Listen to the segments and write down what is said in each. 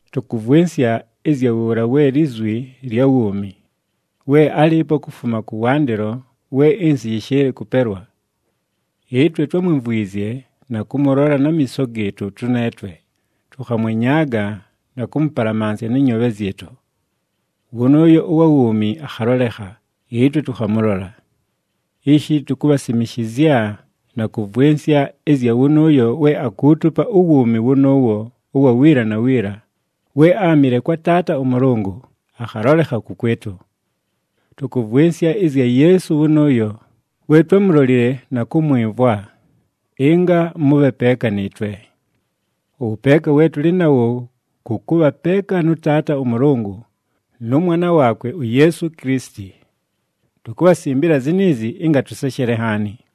Tʉkʉvwɨnsya ɨzya wʉʉla we Lizwi lya wuumi, we álɨɨpo kufuma kʉwandɨlo we ɨnsɨ yɨshɨɨlɨ kʉpelwa. Ɨtwe twámwimvwizye na kʉmʉlola na miiso gɨɨtʉ tʉneetwe, tʉkhamwenyaaga na kʉmʉpalamansya nɨ nyoobhe zyɨtʉ. Wʉnʉʉyo ʉwa wuumi akhalolekha, ɨtwe tʉkhamʉlola. Ishi tukubhasimishizya na kʉvwɨnsya ɨzya wʉnʉʉyo we akuutupa uwuumi wʉnʉʉwo ʉwa wiila na wiila, we áamɨle kwa Taata ʉMʉlʉngʉ, akhalolekha kʉkwɨtʉ. Tʉkʉvwɨnsya ɨzya Yeesu wʉnʉʉyo, we twámulolile na kʉmwɨmvwa, ɨnga mʉbhe peeka nɨɨtwe. Ʉwʉpeeka we tʉlɨ nawo kʉ kʉbha peeka nʉ Taata ʉMʉlʉngʉ, nʉ Mwana waakwe uYeesu Kilisiti. Tukubhasimbila ziniizi, ɨnga tʉseshele nhaani.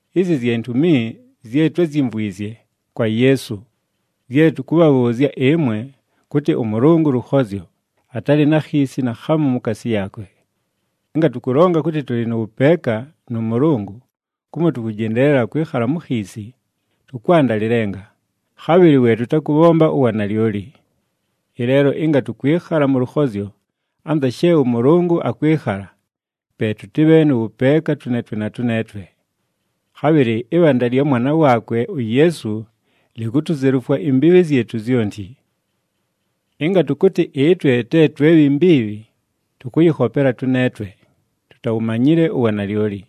Izi zye ntumi zye twázyimvwizye kwa Yeesu, zye tʉkʉbhabhʉʉzya ɨmwe, kʉtɨ ʉMʉlʉngʉ lʉkhozyo, atalɨ na khiisi naakhamu mukaasi yaakwe. Ɨnga tʉkʉlonga kʉtɨ tʉlɨ nʉ wʉpeeka nʉ Mʉlʉngʉ, kumo tʉkʉjendeelela kwɨkhala mu khiisi, tʉkwanda lɨlenga, khabhɨlɨ we tʉtakʉbhomba uwanalyoli. Ɨleelo, ɨnga tʉkwɨkhala mʉ lʉkhozyo, anza she ʉMʉlʉngʉ akwɨkhala, pe tʉtɨbhe nʉ wʉpeeka tʉneetwe na tʉneetwe. Khabhɨlɨ ɨbhanda lya Mwana waakwe uYeesu likutuzelufwa imbiibhi zyɨtʉ zyonti. Ɨnga tʉkʉtɨ ɨtwe te twe bhi mbiibhi, tʉkʉyɨkhopela tʉneetwe, tutawumanyile uwanalyoli.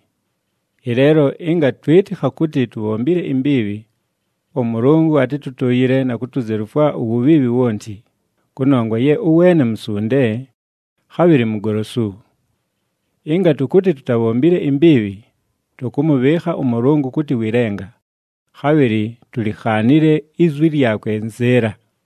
Ɨleelo, ɨnga twɨtɨkha kʉtɨ tubhombile imbiibhi, ʉMʉlʉngʉ atɨtʉtʉʉyɨle na kutuzelufwa uwubhiibhi wonti, kʉnongwa ye ʉweene musunde, khabhɨlɨ mugolosu. Ɨnga tʉkʉtɨ tutabhombile imbiibhi, tʉkʉmʉbhɨɨkha ʉMʉlʉngʉ kʉtɨ wɨ lenga, khabhɨlɨ tulikhaanile izwi lyakwe nzɨɨla.